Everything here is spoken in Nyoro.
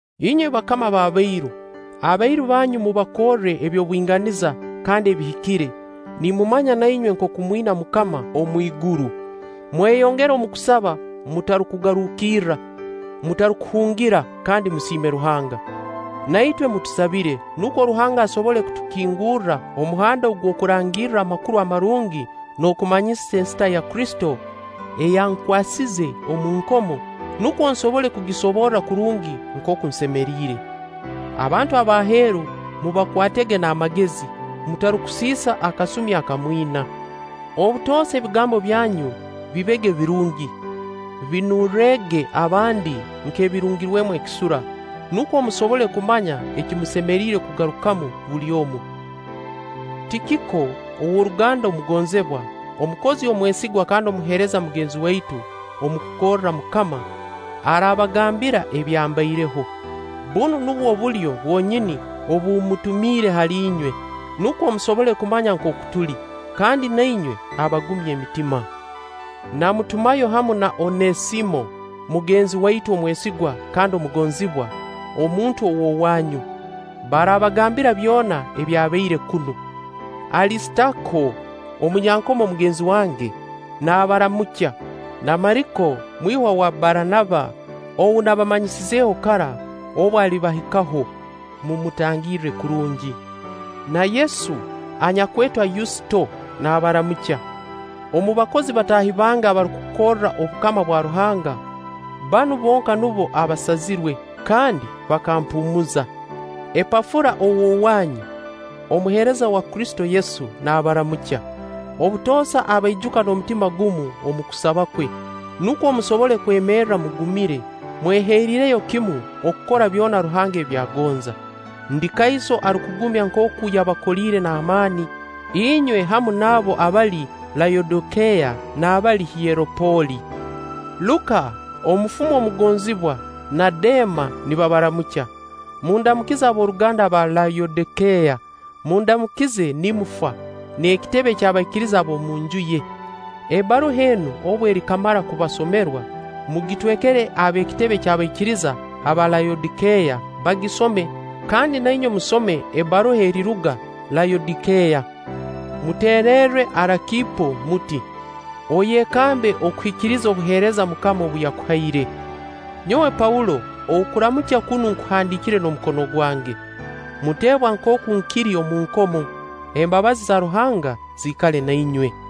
Inywe bakama b'abairu, abairu banyu mubakorre eby'obwinganiza kandi ebihikire, nimumanya na inywe nkooku mwina MUKAMA omwiguru. Mweyongere omu kusaba mutarukugarukirra, mutarukuhungira kandi musiime Ruhanga. Na itwe mutusabire, nukwo Ruhanga asobole kutukingurra omuhanda ogw'okurangirra Amakuru Amarungi n'okumanyisa ensita ya Kristo eyankwasize omu nkomo, nukwo nsobole kugisoborra kurungi nkooku nsemeriire. Abantu ab'aheeru mubakwatege n'amagezi, mutarukusiisa akasumi aka mwina. Obutoosa ebigambo byanyu bibege birungi, binurrege abandi nk'ebirungirwemu ekisura, nukwo musobole kumanya eki musemeriire kugarukamu buli omu. Tikiko, ow'oruganda omugonzibwa, omukozi omwesigwa kandi omuheereza mugenzi waitu omu kukorra MUKAMA, araabagambira ebyambaireho. Bunu nubwo bulyo bwonyini obu mmutumiire hali inywe, nukwo musobole kumanya nkooka tuli, kandi na inywe abagumye emitima. Namutumayo hamu na Oneesimo mugenzi waitu omwesigwa kandi omugonzibwa, omuntu ow'owaanyu. Baraabagambira byona ebyabaire kunu. Alisitaako, omunyankomo mugenzi wange, naabaramukya; na Mariko mwihwa wa Baranaba (ou nabamanyisizeho kara obu alibahikaho, mumutangirre kurungi). Na Yesu, anyakwetwa Yusito, naabaramukya. Omu bakozi bataahi bange abarukukorra obukama bwa Ruhanga, banu bonka nubo abaasazirwe, kandi bakampuumuza. Epafura ow'owaanyu, omuheereza wa Kristo Yesu, naabaramukya. Obutoosa abaijuka n'omutima gumu omu kusaba kwe, nukwo musobole kwemerra mugumire, mweheriireyo kimu okukora byona Ruhanga ebi agonza. Ndi kaiso arukugumya nkooku yabakoliire n'amaani, inywe hamu n'abo abali Layodikeeya n'abali Hieraapoli. Luka, omufumu omugonzibwa, na Deema nibabaramukya. Mundamukize ab'oruganda abali Layodikeeya. Mundamukize Nimfa, n'ekitebe ky'abaikiriza ab'omu nju ye. Ebbaruha enu obu erikamara kubasomerwa, mugitwekere ab'ekitebe ky'abaikiriza aba Layodikeeya bagisome; kandi na inywe musome ebbaruha eriruga Layodikeeya. Muteererre Arakiipo muti: “Oyekambe okuhikiriza obuheereza MUKAMA obu yakuhaire.” Nyowe Paulo okuramukya kunu nkuhandiikire n'omukono gwange. Muteebwa nkooku nkiri omu nkomo. Embabazi za Ruhanga ziikale na inywe.